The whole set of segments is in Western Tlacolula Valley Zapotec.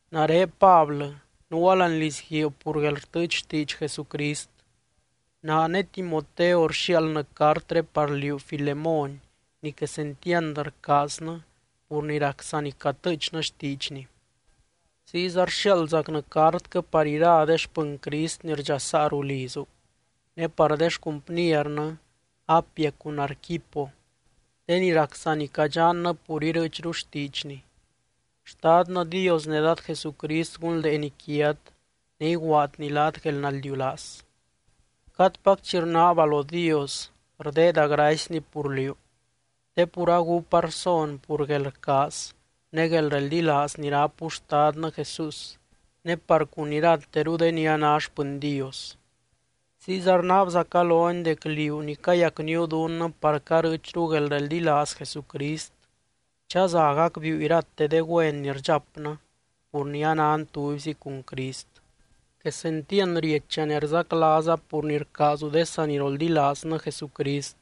Nare Pablɨ, nuua láani lizguiib pur guelrtɨɨch xtiidx Jesucrist. Naa ne Timoteo rxiaaldnɨ cartré par liú, Filemón ni quesentiand rcaaznɨ pur ni rac saa ni catɨɨchnɨ xtiidxny. Ziyza rxiaaldzacnɨ cartquɨ par ira de xpɨny Crist ni rdxasaa ruu lizu, ne par de xcumpniernɨ Apia cun Arquipo, de ni rac saa ni cadxannɨ pur irɨɨchru xtiidxny. Xtadnɨ Dios ne Dad Jesucrist gunldeeny quiat ne iguaadny laat guelnaldiulaaz. Cadpac chi rnaaba lo Dios rdeeda gracyny pur liú, te pur agúpa rson pur guelrcaaz ne guelreldilaaz ni rápu Xtadnɨ Jesús ne par cun irateru de ni a ná xpɨny Dios. Ziyza rnaabzaca lony dec liú ni cayacníu dunnɨ par carɨɨchru guelreldilaaz Jesucrist, chaza gacbiiu irate de güen ni rdxapnɨ pur ni anan tubyzi cun Crist. Quesentiand riecha ne rzaclaaza pur ni rcaazu de saniroldilaaznɨ Jesucrist,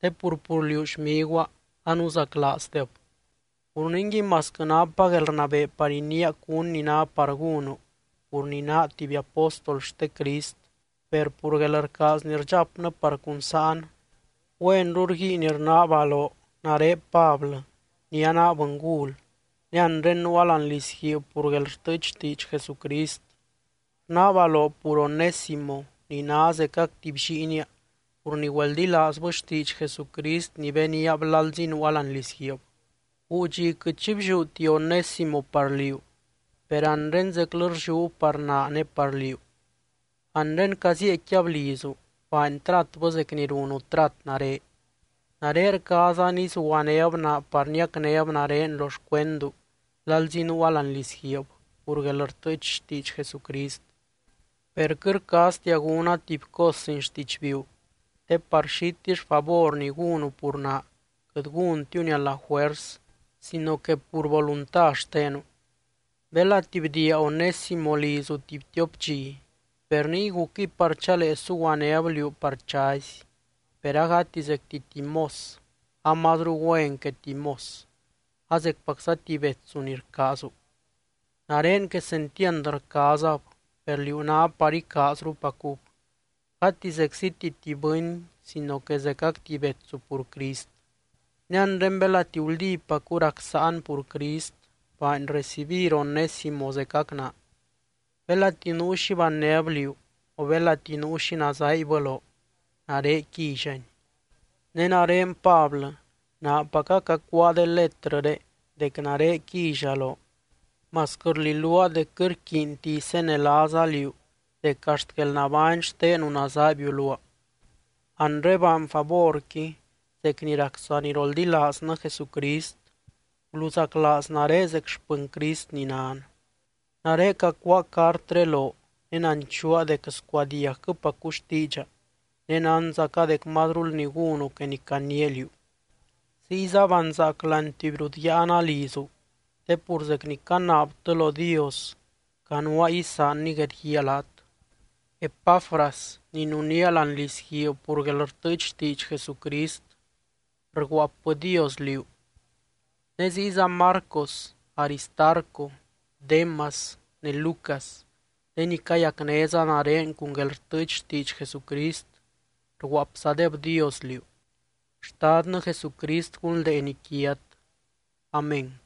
te pur, pur liú, xmiguaa, anuzaclaazdeb. Pur ningui, masquɨ napa guelrnabee par iniia cún ni ná par gúnu pur ni naa tuby apóstol xte Crist, per pur guelrcaaz ni rdxapnɨ par cun sáan, güenru rguiin rnaaba loo nare Pablɨ ni anaa bɨngul ne anre nuua láani lizguiib pur guelrtɨɨch xtiidx Jesucrist, rnaaba loo pur Onésimo ni ná zecac tuby lliinia pur ni güeldilaazbɨ xtiidx Jesucrist ni beniab lalzi nuua láani lizguiib. Guu dxi quɨt xi blliúti Onésimo par liú, per anre zeclɨ rlliúb par naa ne par liú. Anre cazieecquiab lizu, baany tratbɨ zec ni runu trat nare. Nare rcaaza nizuguanéb naa par niacnéb nare lo xcuendu lalzi nuua láani lizguiib pur guelrtɨɨch xtiidx Jesucrist. Per quɨt rcaaztia gúna tuby cos sin xtidxbiiu, te par xitill favor ni gúnu pur naa quɨt gúntiuni a la juers sino que pur volunta xtenu. Belati bdiia Onésimo lizu tuby tiop dxi, per niy gucquɨy par chalee suguanéb liú par chazy, per agati zecti tuby mos, amazru güen que tuby mos, a zecpacza tuby betsu ni rcaazu. Nare quesentiand rcaazab, per liú ná par icaazrupacub, gati zecziti tuby bɨny sino que zecac tuby betsu pur Crist. Ne anre belati guldípacu rac sáan pur Crist, baany recibir Onésimo zecac naa. Belati nuu xi bannéb liú, o belati nuu xi nazaaibbɨ loo, nare quíllani. Ne nare Pablɨ, naapaca cacuáa de letrɨré dec nare quilla loo, masquɨ rliluaa dec quɨt rquiinti isenelaaza liú dec axt guelnabány xtenu nazabiu luaa. Anre baany favorqui zec ni rac saniroldilaaznɨ Jesucrist: guluzaclaaz nare zec xpɨny Crist ni nan. Nare cacuáa cartré loo ne nanchuua dec scuadiagquɨpacu xtiidxa, ne nánzaca dec mazrul ni gúnu que ni caniia liú. Ziyza banzaac láani tuby rut yáana lizu, te pur zec ni canaabtɨ lo Dios, canuaa isaanny guedguíaa laat. Epafras, ni nunía láani lizguiib pur guelrtɨɨch xtiidx Jesucrist, rguaapbɨdios liú. Ne ziyza Marcos, Aristarco, Démas ne Lucas, de ni cayacnéza nare cun guelrtɨɨch xtiidx Jesucrist rguaapzadebdios liú. Xtadnɨ Jesucrist gunldeeny quiat. Amén.